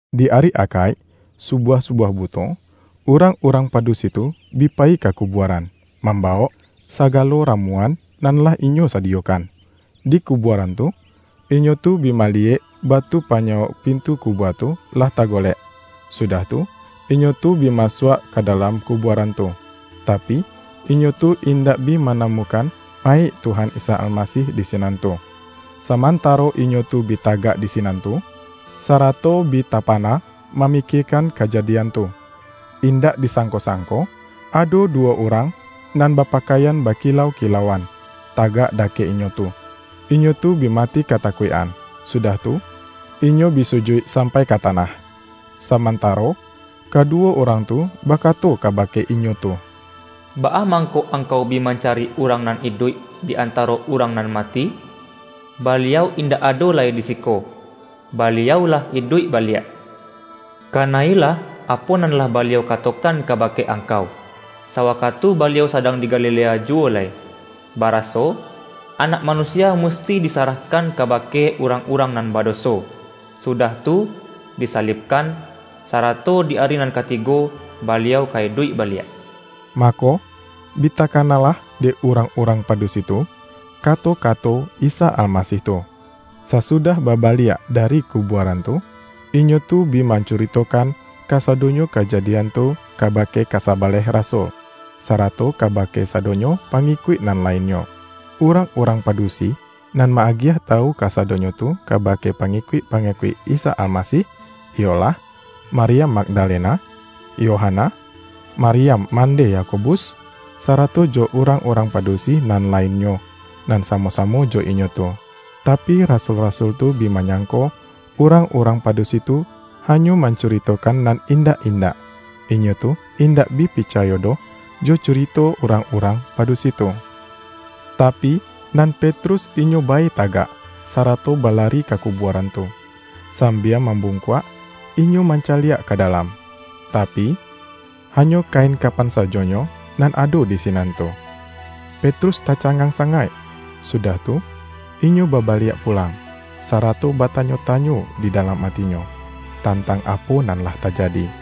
Di ari Akaik, subuah-subuah buto, urang-urang padusi tu bi payi ka kubuaran, mambawok sa-galo ramuan nan lah inyo sadiyokan. Di kubuaran tu, inyo tu bi maliyek batu panyawok pintu kubua tu, lah ta-golek. Sudah tu, inyo tu bi masuak ka dalam kubuaran tu, tapi, inyo tu indak bi manamukan mayik Tuhan Isa Almasih di sinan tu. Samantaro inyo tu bi tagak di sinan tu, sarato bi tapa-na mamikiekan kajadian tu, indak di-sangko-sangko, ado duwo urang nan bapakaian bakilau-kilauan, tagak da-kek inyo tu. Inyo tu bi mati katakuik-an, sudah tu, inyo bi sujuik sampai ka tanah, samantaro kaduwo urang tu bakato kabake inyo tu,”Baa mangko angkau bi mancari urang nan iduik di antaro urang nan mati? Baliau in-dak ado lai di siko. Baliau lah iduik baliak! Kana-ilah apo nan lah Baliau katokan kabake angkau, sawakatu Baliau sadang di Galilea juwo lai, baraso, ’Anak Manusia musti disarah-kan kabake urang-urang nan badoso, sudah tu, disalibkan, sarato di ari nan katigo Baliau ka iduik baliak.’” Mako, bi takanalah dek urang-urang pa-dusi tu, kato-kato Isa Almasih tu Sasudah babaliak dari kubuaran tu, inyo tu bi man-curitokan, kasadonyo kajadian tu kabake kasabaleh rasul, sarato kabake sadonyo pa-ngikuik nan lainnyo. Urang-urang padu-si, nan ma-agiah tawu kasadonyo tu kabake pangikuik-pangikuik Isa Almasih, iyolah: Maryam Magdalena, Yohana, Maryam mandeh Yakobus, sarato jo urang-urang pa-dusi nan lainnyo, nan samo-samo jo inyo tu Tapi, rasul-rasul tu bi manyangko, urang-urang padusi tu hanyo mancuritokan nan indak-indak. Inyo tu indak bi picayo doh jo curito urang-urang padusi tu. Tapi, nan Petrus inyo bae tagak, sarato balari ka ku-buaran tu. Sambia mambungkuak, inyo mancaliak ka dalam, tapi, hanyo kain ka-pan sajonyo nan ado di sinan tu. Petrus taca-ngang sangaik, sudah tu, inyo babaliak pu-lang, sarato batanyo-tanyo di dalam atinyo, tantang apo nan lah tajadi.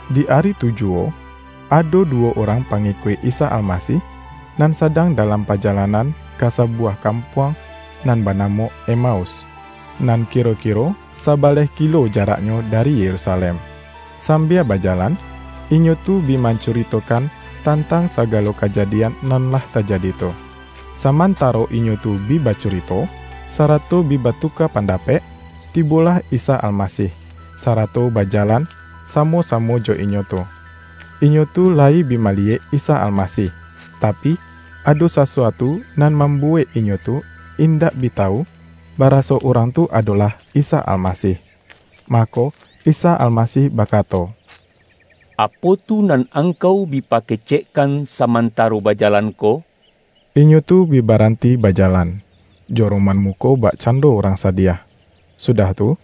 Di ari tu juwo, ado duwo urang pangikuik Isa Almasih, nan sadang dalam pajalanan ka sabuwah kampuang nan banamo Emaus, nan kiro-kiro sa-baleh kilo jaraknyo dari Yerusalem. Sambia bajalan, inyo tu bi mancu-ritokan tantang sagalo kajadian nan lah tajadi tu. Samantaro inyo tu bi bacurito, sarato bi batuka pandapek, tibolah Isa Almasih, sarato bajalan sa-mo-samo jo inyo tu. Inyo tu layi bi maliyek Isa Almasih, tapi, ado sasu-atu nan mambuwek inyo tu indak bi tawu, baraso Urang tu adolah Isa Al-masih. Mako, Isa Almasih bakato,”Apo tu nan angkau bi pakecekkan samantaro bajalan ko?” Inyo tu bi baranti bajalan, jo ro-man muko bakcando urang sadiah. Sudah tu,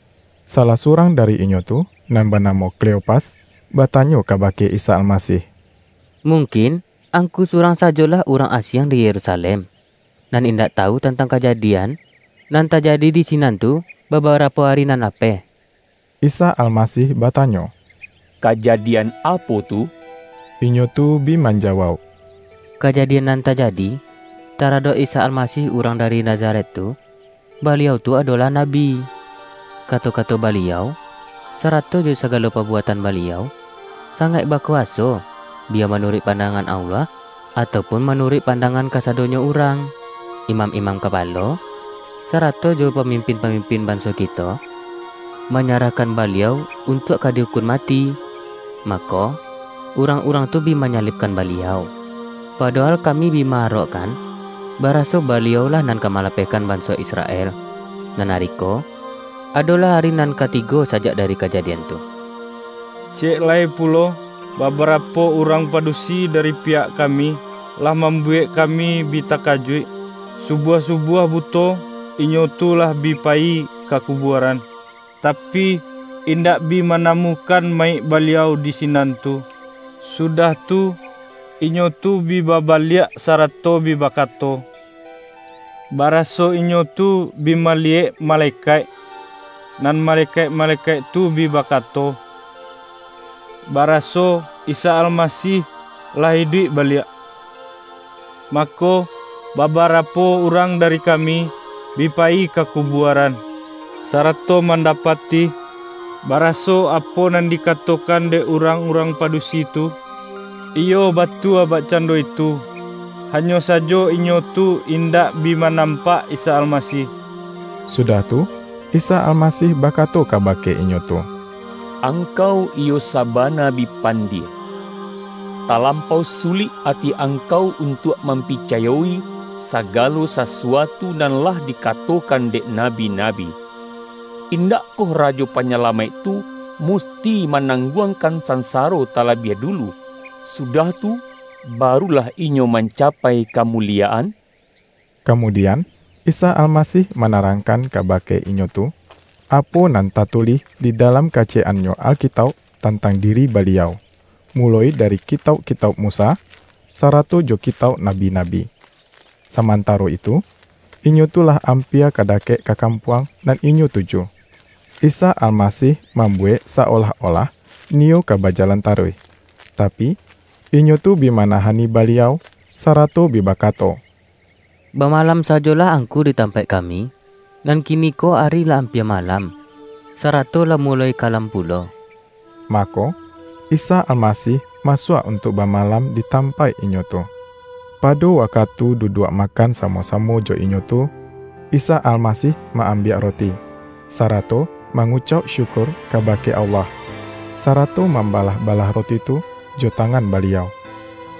salah surang dari inyo tu, nan banamo Kleopas, batanyo ka-bake Isa Almasih,”Mungkin, Angku surang sajolah urang asiang di Yeru-salem, nan indak tawu tantang kaja-dian, nan tajadi di sinan tu babarapo ari nan lapeh?” Isa Almasih batanyo,”Kajadian apo tu?” Inyo tu bi manjawauk,”Kajadian nan tajadi, taradok Isa Almasih urang dari Nazaret tu, Baliau tu adolah Na-bi. Kato-kato Baliau, sarato jo sagalo pabuatan Baliau, sangaik bakuwaso biya manuruik pandangan Allah, atau pun manuruik pandangan kasa-donyo urang. Imam-imam kapalo, sarato jo pamimpin-pamimpin banso kito, manyarahkan Baliau untuak ka di-ukun mati, mako, urang-urang tu bi manyalibkan Baliau! Padohal ka-mi bi ma-arokkan, baraso Baliau-lah nan ka malapehkan banso Israel! Nan ari ko, adolah ari nan katigo sajak da-ri kajadian tu. Ciyek lai pulo, ba-barapo urang padusi dari piyak kami, lah mambuwek kami bi takajuik. Su-buah-subuah buto, inyo tu lah bi payi ka kubuaran, tapi, indak bi mana-mukan mayik Baliau di sinan tu. Su-dah tu, inyo tu bi babaliak, sarato bi bakato, baraso inyo tu bi maliyek ma-lekaik, nan malekaik-malekaik tu bi bakato, baraso Isa Almasih lah iduik baliak. Mako, babarapo urang da-ri kami, bi payi ka kubuaran, sarato mandapati, baraso apo nan dikatokan dek urang-urang padusi tu, iyo batua bakcando itu, hanyo sajo inyo tu in-dak bi manampak Isa Almasih.” Sudah tu, Isa Almasih bakato ka-bake inyo tu,”Angkau iyo sabana bi pandie! Talampau sulik ati angkau un-tuak mampicayo-i, sagalo sasuatu nan lah dikatokan dek nabi-nabi! Indak-koh Rajo Panyalamaik tu musti ma-nangguangkan sansaro talabiah dulu, sudah tu, barulah Inyo mancapai ka-muliyaan?” Kamudian, Isa Almasih manarangkan kabake inyo tu, apo nan tatulih di dalam kaciyek-annyo Alkitauk tantang diri Baliau, muloi dari kitauk-kitauk Musa, sarato jo ki-tauk nabi-nabi. Samantaro itu, inyo tu lah ampia ka dakek ka kampuang nan inyo tuju. Isa Almasih mambuwek sa-olah-olah niyo ka bajalan taruih, tapi, inyo tu bi manahani Baliau, sarato bi baka-to,”Bamalam sajolah Angku di tam-paik kami, nan kiniko ari lah ampia malam, sarato lah muloi kalam pulo.” Mako, Isa Almasih masuak untuak ba-malam di tampaik inyo tu. Pado wa-katu duduak makan samo-samo jo inyo tu, Isa Almasih ma-ambiak roti, sara-to mangucauk syukur kabake Allah, sarato mambalah-balah roti tu jo ta-ngan Baliau,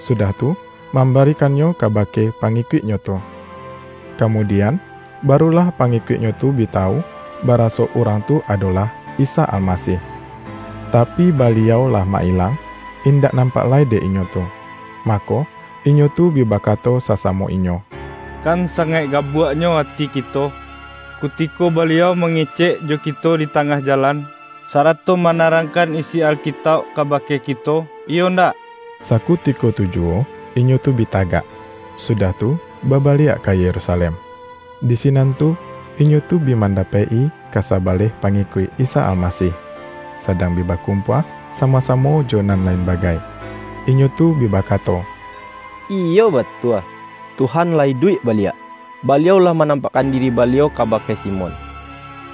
sudah tu mambarikannyo kabake pangikuik-Nyo tu. Kamudi-an, barulah pangikuik-Nyo tu bi tawu, baraso Urang tu adolah Isa Almasih. Tapi, Baliau lah ma-ilang, indak nam-pak lai dek inyo tu. Mako, inyo tu bi bakato sasamo inyo,”Kan sangaik gabuaknyo ati kito, kutiko Baliau ma-ngecek jo kito di tangah jalan, sarato manarangkan isi Alkitauk kabake ki-to, iyo ndak?” Sakutiko tu juwo inyo tu bi tagak, sudah tu babaliak ka Yerusalem. Di sinan tu, inyo tu bi mandapek-i kasa-baleh pangikuik Isa Almasih, sadang bi bakumpua samo-samo jo nan lain bagai. Inyo tu bi bakato,”Iyo ba-tua, Tuhan lah iduik baliak! Baliau lah manampakkan diri Baliau kaba-ke Simon!”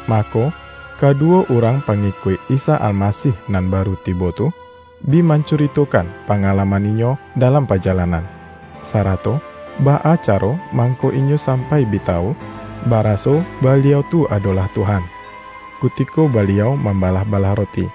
Mako, kaduwo urang pangikuik Isa Almasih nan baru tibo tu, bi man-curitokan pangalaman inyo dalam pa-jalanan, sarato baa caro mangko inyo sampai bi tawu, baraso Baliau tu ado-lah Tuhan, kutiko Baliau mambalah-balah roti.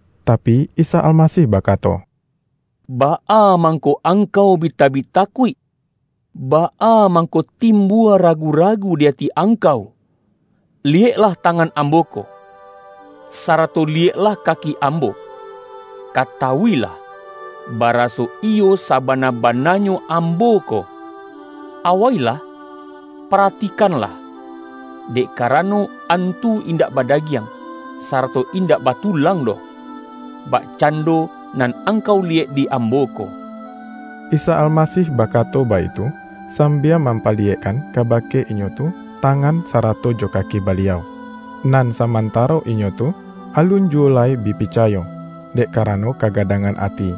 Tapi, Isa Almasih bakato,”Baa mangko angkau bi tabik takuik? Baa mang-ko timbua ragu-ragu di ati angkau? Liyeklah tangan Ambo ko, sarato li-yeklah kaki Ambo. Katawu-ilah, ba-raso iyo sabana-bananyo Ambo ko! Awailah, paratikanlah, dek karano, antu indak badagiang, sarato indak batulang doh, bakcando nan angkau liyek di Ambo ko.” Isa Almasih bakato baitu, sam-bia mampaliyekkan kabake inyo tu, tangan, sarato jo kaki Baliau. Nan samantaro inyo tu, alun juwo lai bi picayo, dek karano kagadangan ati,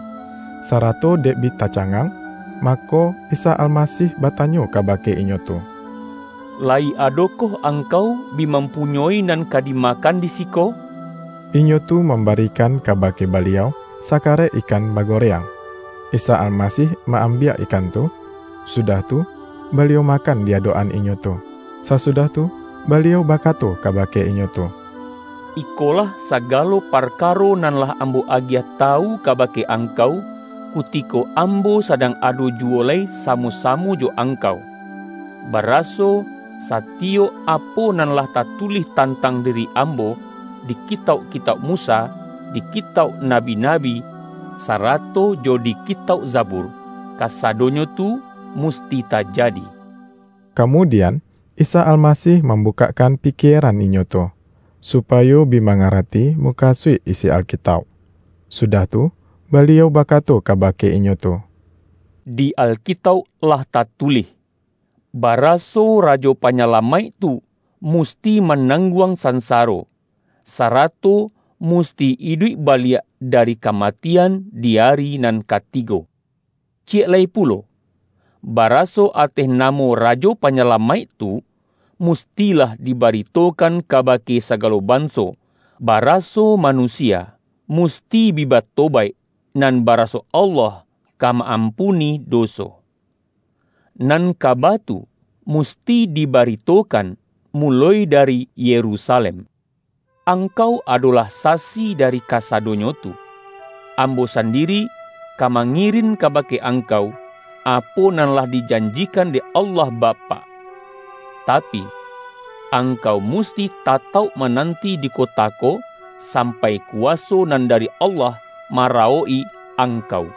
sarato dek bi tacangang, mako, Isa Almasih batanyo kabake inyo tu,”La-yi adokoh angkau bi mampunyoi nan ka dimakan di siko?” Inyo tu mam-barikan kabake Baliau, sakarek ikan bagoreang. Isa Almasih ma-ambiak ikan tu, sudah tu, Baliau makan di adok-an inyo tu. Sasudah tu, Baliau bakato kaba-ke inyo tu,”Ikolah sagalo parkaro nan lah Ambo agiah tawu kabake angkau, kutiko Ambo sadang ado juwo lai sa-mo-samo jo angkau: baraso, satiyok apo nan lah tatulih tantang diri Am-bo, di Kitauk-kitauk Musa, di Kitauk Nabi-nabi, sarato jo di Kitauk Zabur, kasadonyo tu musti tajadi.” Kamudian, Isa Almasih mambu-kakkan pikieran inyo tu, supayo bi ma-ngarati mukasuik isi Alkitauk. Sudah tu, Baliau bakato kabake inyo tu,”Di Alkitauk lah tatulih, baraso Rajo Panyalamaik tu musti manang-guang sansaro, sarato musti iduik ba-liak dari kamatian di ari nan katigo. Ciyek lai pulo, baraso ateh namo Rajo Panyalamaik tu, mustilah diba-ritokan kabake sagalo banso, baraso manusia musti bi batobaik, nan ba-raso Allah ka ma-ampuni doso. Nan kaba tu musti dibaritokan muloi da-ri Yerusalem. Angkau adolah sasi dari kasadonyo tu. Ambo sandiri ka mangirin kabake angkau, apo nan lah dijanjikan dek Allah Bapak. Tapi, angkau musti tatauk mananti di ko-ta ko, sampai kuwaso nan dari Allah marawok-i angkau.”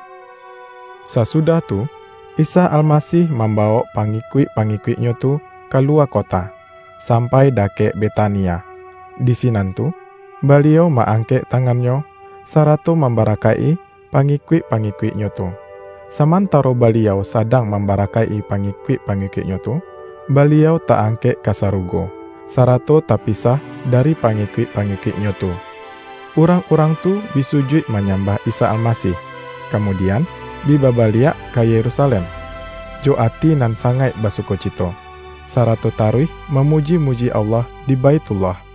Sasudah tu, Isa Almasih mamba-wok pangikuik-pangikuik-Nyo tu kalu-wa kota, sampai dakek Betania. Di si-nan tu, Baliau ma-angkek tangan-Nyo, sarato mambarakaik-i pangikuik-pa-ngikuik-Nyo tu. Samantaro Baliau sadang mambarakaik-i pangikuik-pa-ngikuik-Nyo tu, Baliau ta-angkek ka sarugo, sarato tapisah dari pangikuik-pangikuik-Nyo tu. Urang-urang tu bi sujuik manyambah Isa Almasih, kamudian, bi babaliak ka Yerusa-lem, jo ati nan sangaik basukocito, sarato taruih mamuji-muji Allah di Baithullah.